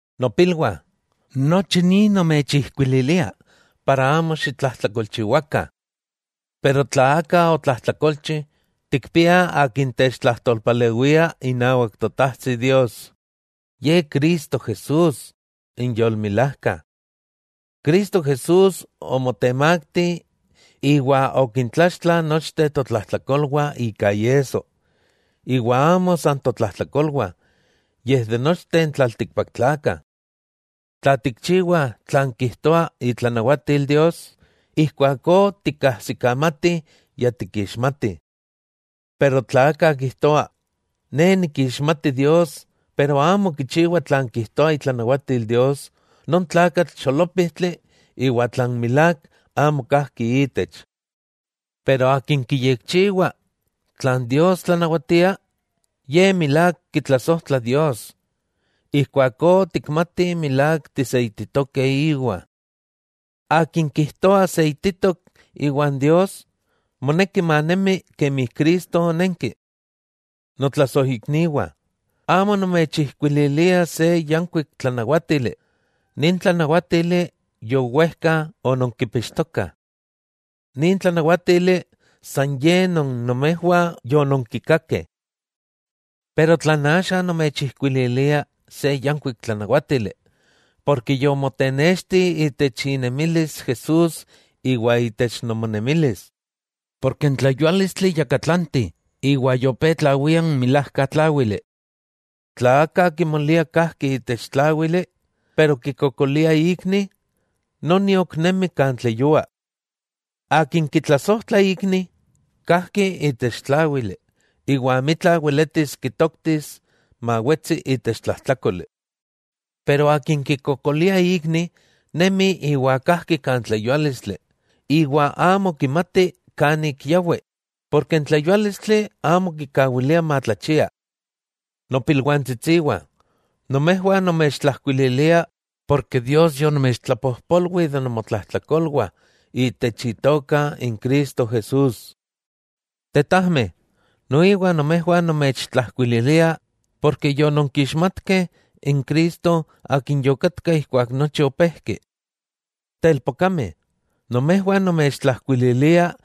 Nopilwah, nochi ni nomechijkuililia para amo xitlajtlakolchiwakah. Pero tla aka otlajtlakolchi, tikpiah Akin techtlajtolpalewia inawak Totajtsi Dios, Ye Cristo Jesús, n yolmilajka. Cristo Jesús omotemakti iwa okintlaxtla nochteh totlajtlakolwah ika iesso, iwa amo san totlajtlakolwah, yej de nochteh n tlaltikpaktlakah. Tla tikchiwah tlan kijtoa itlanawatil Dios, ijkuakó tikkajsikamati ya tikixmatih. Pero tla aka kijtoa: “Ne nikixmati Dios”, pero amo kichiwa tlan kijtoa itlanawatil Dios, non tlakatl xolópijtli iwa tlan milák amo kajki ítech. Pero akin kiyekchiwa tlan Dios tlanawatia, ye milák kitlasojtla Dios, ijkuakó tikmatih milák tiseititokeh íwa. Akin kijtoa seititok iwan Dios, moneki manemi kemi Cristo onenki. Notlasojikniwah, amo nomechijkuililia se yankuik tlanawátili, nin tlanawátili yowejka ononkipixtokah. Nin tlanawátili san ye non nomejwah yononkikakeh. Pero tlan axa nomechijkuililia se yankuik tlanawátili, porke yomotenexti itech inemilis Jesús iwa itech nomonemilis, porke n tleyuálistli yakatlanti, iwa yopé tlawia n milajka tláwili. Tla aka kimolia kajki itech tláwili, iwa kikokolia ikni, ok nemi kan tleyua. Akin kitlasojtla ikni, kajki itech tláwili, iwa amitla weletis kitoktis mawetsi itech tlajtlákoli. Iwa akin kikokolia ikni, nemi iwa kajki kan tleyuálistli, iwa amo kimati kan ik yawi, porke n tleyuálistli amo kikawilia matlachia. Nopilwantsitsiwah, nomejwah nomechtlajkuililia ken Dios yonomechtlapojpolwi de nomotlajtlakolwah itech Itoka n Cristo Jesús. Tetajmeh, noiwa nomejwah nomechtlajkuililia ken yononkixmatkeh n Cristo Akin yokatka ijkuak nochi opéjki. Telpokameh, nomejwah nomechtlajkuililia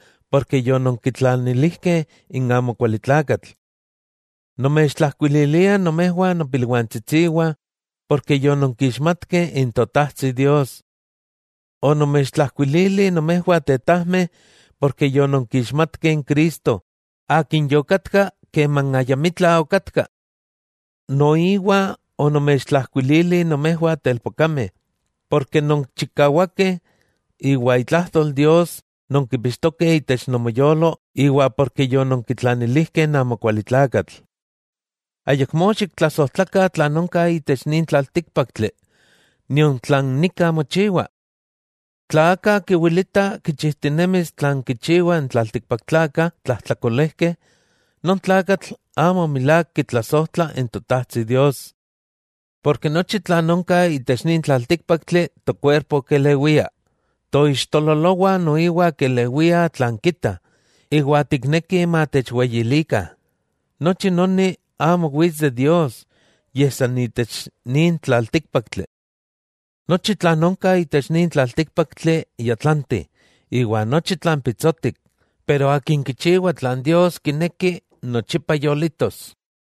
ken yononkitlanilijkeh n amokualitlakatl. Nomechtlajkuililia nomejwah nopilwantsitsiwah, ken yononkixmatkeh n Totajtsi Dios. Onomechtlajkuilili nomejwah tetajmeh, ken yononkixmatkeh n Cristo Akin yokatka keman ayamitla okatka. Noiwa onomechtlajkuilili nomejwah telpokameh, porke nonchikawakeh iwa itlajtol Dios nonkipixtokeh itech nomoyolo, iwa porke yononkitlanilijkeh n amokualitlakatl. Ayakmó xiktlasojtlakah tlan onka itech nin tlaltíkpaktli nion tlan nika mochiwa. Tla aka kiwilita kichijtinemis tlan kichiwah n tlaltikpaktlakah tlajtlakolejkeh, non tlakatl amo milák kitlasojtla n Totajtsi Dios. Porke nochi tlan onka itech nin tlaltíkpaktli tokuerpo kelewia, toixtololowah noiwa kelewiah tlan kita, iwa tikneki matechweyilikah, nochi noni amo wits de Dios, yej san itech nin tlaltíkpaktli. Nochi tlan onka itech nin tlaltíkpaktli ya tlanti, iwa nochi tlan pitsotik, pero akin kichiwah tlan Dios kineki nochipa yolitos.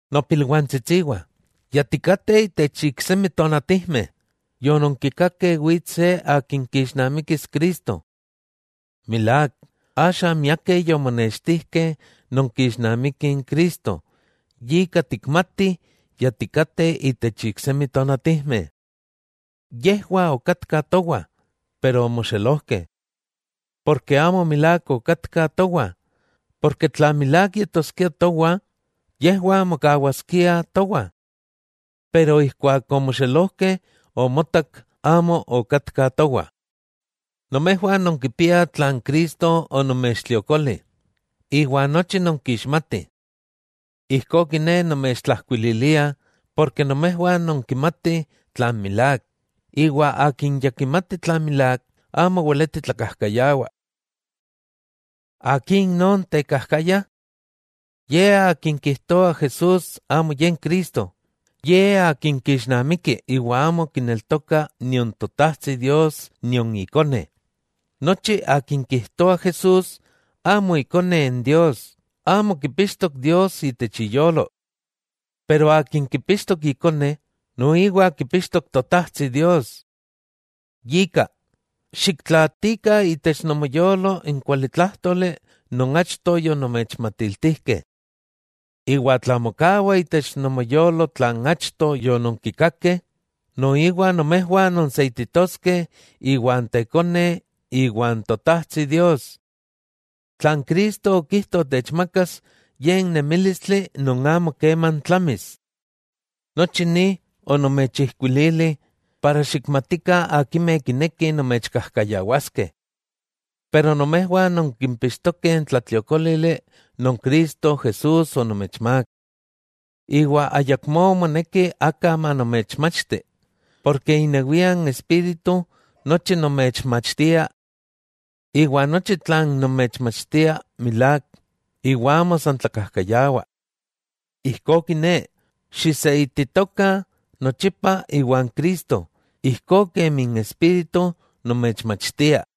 Nopilwantsitsiwah, ya tikateh itech iksemi tonatijmeh, yononkikakeh wits se akin kixnamikis Cristo. Milák, axa miakeh yomonextijkeh non kixnamiki n Cristo, yika tikmatih ya tikateh itech iksemi tonatijmeh. Yejwah okatkah towa, iwa omoxelojkeh. Ken amo milák okatkah towah, porke tla milák yetoskiah towah, yejwah mokawaskiah towah. Ijkuak omoxelojkeh omotak amo okatka towah. Nomejwah nonkipiah tlan Cristo onomechtliokoli, iwa nochi nonkixmatih. Ijkó kiné nomechtlajkuililia, porke nomejwah nonkimatih tlan milák, iwa akin ya kimati tlan milák, amo weleti tlakajkayawah. ¿Akin non tekajkaya? Ye akin kijtoa Jesús amo ye n Cristo, ye akin kixnamiki iwa amo kineltoka nion Totajtsi Dios nion Ikone. Nochi akin kijtoa Jesús amo Ikone Dios, amo kipixtok Dios itech iyolo. Pero akin kipixtok Ikone, noiwa kipixtok Totajtsi Dios. Yika, xiktlaatikah itech nomoyolo n kualitlájtoli non achto yonomechmatiltijkeh. Iwa tla mokawa itech nomoyolo tlan achto yononkikakeh, noiwa nomejwah nonseititoskeh iwan Tekone iwan Totajtsi Dios. Tlan Cristo okijto techmakas, ye n nemílistli non amo keman tlamis. Nochi ni onomechijkuilili para xikmatikah akimeh kinekih nomechkajkayawaskeh. Pero nomejwah nonkipixtokeh n tlatliokólili non Cristo Jesús onomechmák. Iwa ayakmó moneki aka manomechmachti, porke inewia n Espíritu nochi nomechmachtia. Iwa nochi tlan nomechmachtia milák, iwa amo san tlakajkayawa. Ijkó kiné, xiseititokah nochipa iwan Cristo, ijkó kemi n Espíritu nomechmachtia.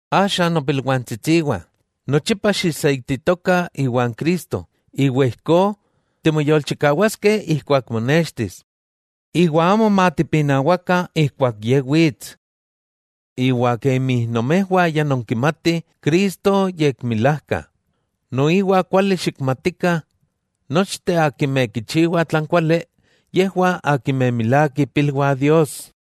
Axa nopilwantsitsiwah, nochipa xiseititokah iwan Cristo, iwa ijkó timoyolchikawaskeh ijkuak monextis, iwa amo matipinawakah ijkuak Ye wits. Iwa kemi nomejwah ya nonkimatih Cristo yekmilajka, noiwa kuali xikmatikah nochteh akimeh kichiwah tlan kuali, yejwah akimeh milák ipilwah Dios.